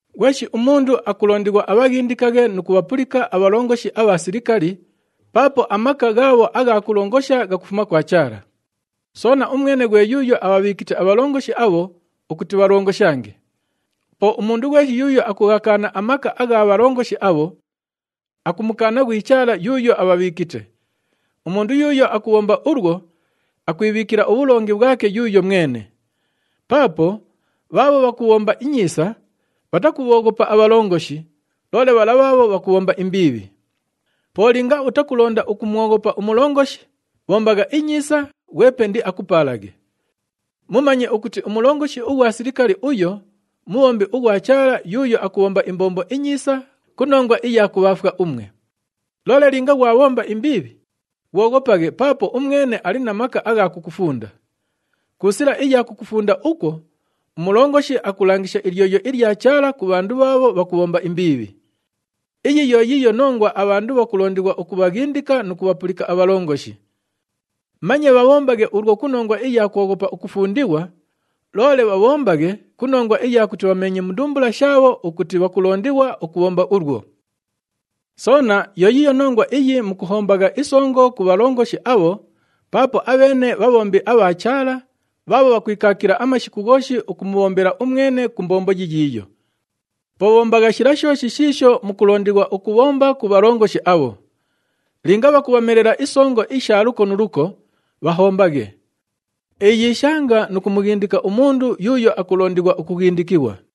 Ghweshi umundu akulondighwa abhaghindikaghe nu kubhapulika abhalongoshi abha silikali, paapo amaka ghaabho agha kulongosha ghakufuma kwa Chaala. Soona, umwene ghwe yuuyo abhabhiikite abhalongoshi abho ukuti bhalongoshange. Po umundu ghweshi yuuyo akughakaana amaka agha bhalongoshi abho, akumukaana ghwi Chaala yuuyo abhabhiikite. Umundu yuuyo akubhomba ulwo, akwibhiikila ubhulongi bhwake yuuyo mwene. Paapo bhaabho bhakubhomba inyiisa, bhatakubhooghopa abhalongoshi, loole bhala bhaabho bhakubhomba imbiibhi. Po linga utakulonda ukumwoghopa umulongoshi, bhombagha inyiisa, ghwepe indiakupaalaghe. Mumanye ukuti umulongoshi ughwa silikali uyo mubhombi ughwa Chaala yuuyo akubhomba imbombo inyiisa ku nongwa iya kubhaafwa umwe. Loole linga ghwabhomba imbiibhi, ghwoghopaghe paapo umwene ali na maka agha kukufunda. Ku sila iya kukufunda ukwo, umulongoshi akulangisha ilyoyo ilya Chaala ku bhandu bhaabho bhakubhomba imbiibhi. Iyi yo yiiyo nongwa abhandu bhakulondighwa ukubhaghindika nu kubhapulika abhalongoshi. Manye bhabhombaghe ulwo ku nongwa iya kwoghopa ukufundighwa, loole bhabhombaghe ku nongwa iya kuti bhameenye mu ndumbula shaabho ukuti bhakulondighwa ukubhomba ulwo. Soona yo yiiyo nongwa iyi mukuhombagha isongo ku bhalongoshi abho paapo abheene bhabhombi abha Chaala bhaabho bhakwikaakila amashiku ghooshi ukumubhombela umwene ku mbombo yiyiiyo. Po bhombagha shila shooshi shiisho mukulondighwa ukubhomba ku bhalongoshi abho. Linga bhakubhamelela isongo isha luko nu luko, bhahombaghe. Iyiishanga nu kumughindika umundu yuuyo akulondighwa ukughindikighwa.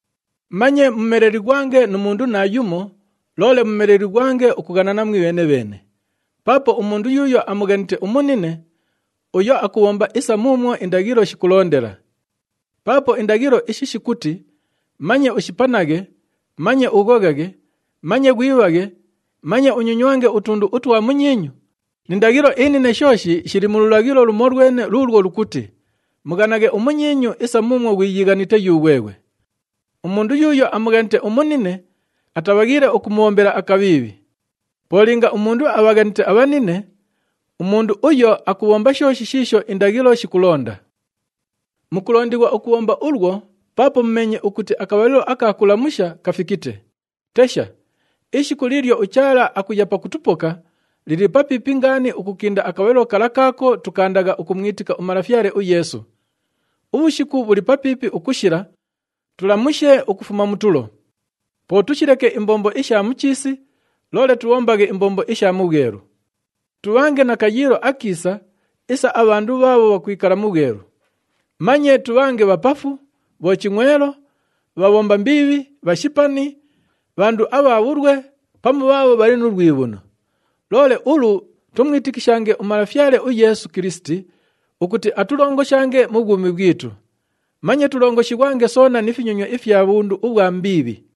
Manye mumelelighwange nu mundu naayumo, loole mumelelighwange ukughanana mwibheene-bheene. Paapo umundu yuuyo amughanite umunine, uyo akubhomba isa muumwo indaghilo shikulondela. Paapo indaghilo ishi shikuti, “Manye ushipanaghe, manye ughoghaghe, manye ghwibhaghe, manye unyonywange utundu utwa munyiinyu” ni ndaghilo inine shooshi shili mu lulaghilo lumolwene luulwo lukuti, “Mughanaghe umunyiinyu isa muumwo ghwiyiighanite yughweghwe.” Umundu yuuyo amughanite umunine, atabhaghiile ukumubhombela akabhiibhi. Po linga umundu abhaghanite abhanine, umundu uyo akubhomba shooshi shiisho indaghilo shikulonda. Mukulondighwa ukubhomba ulwo paapo mumeenye ukuti akabhalilo aka kulamusha kafikite. Tesha! Ishiku liilyo uChaala akuya pakutupoka, lili papiipi ngaani ukukinda akabhalilo kala kaako tukaandagha ukumwitika uMalafyale uYeesu. Ubhushiku bhuli papiipi ukushila, tulamushe ukufuma mu tulo. Po tushileke imbombo isha mu chiisi, loole tubhombaghe imbombo isha mu bhwelu. Tubhange na kayiilo akiisa isa abhandu bhaabho bhakwikala mu bhwelu. Manye tubhange bhapafu, bhochingʼwelo, bhabhomba imbiibhi, bhashipani, bhandu abha bhulwe pamu bhaabho bhali nu lwibhuno. Loole ulu tumwitikishange uMalafyale uYeesu Kilisiti ukuti atulongoshange mu bhwumi bhwitu. Manye tulongoshighwange soona ni finyonywa ifya bhundu ubhwa mbiibhi.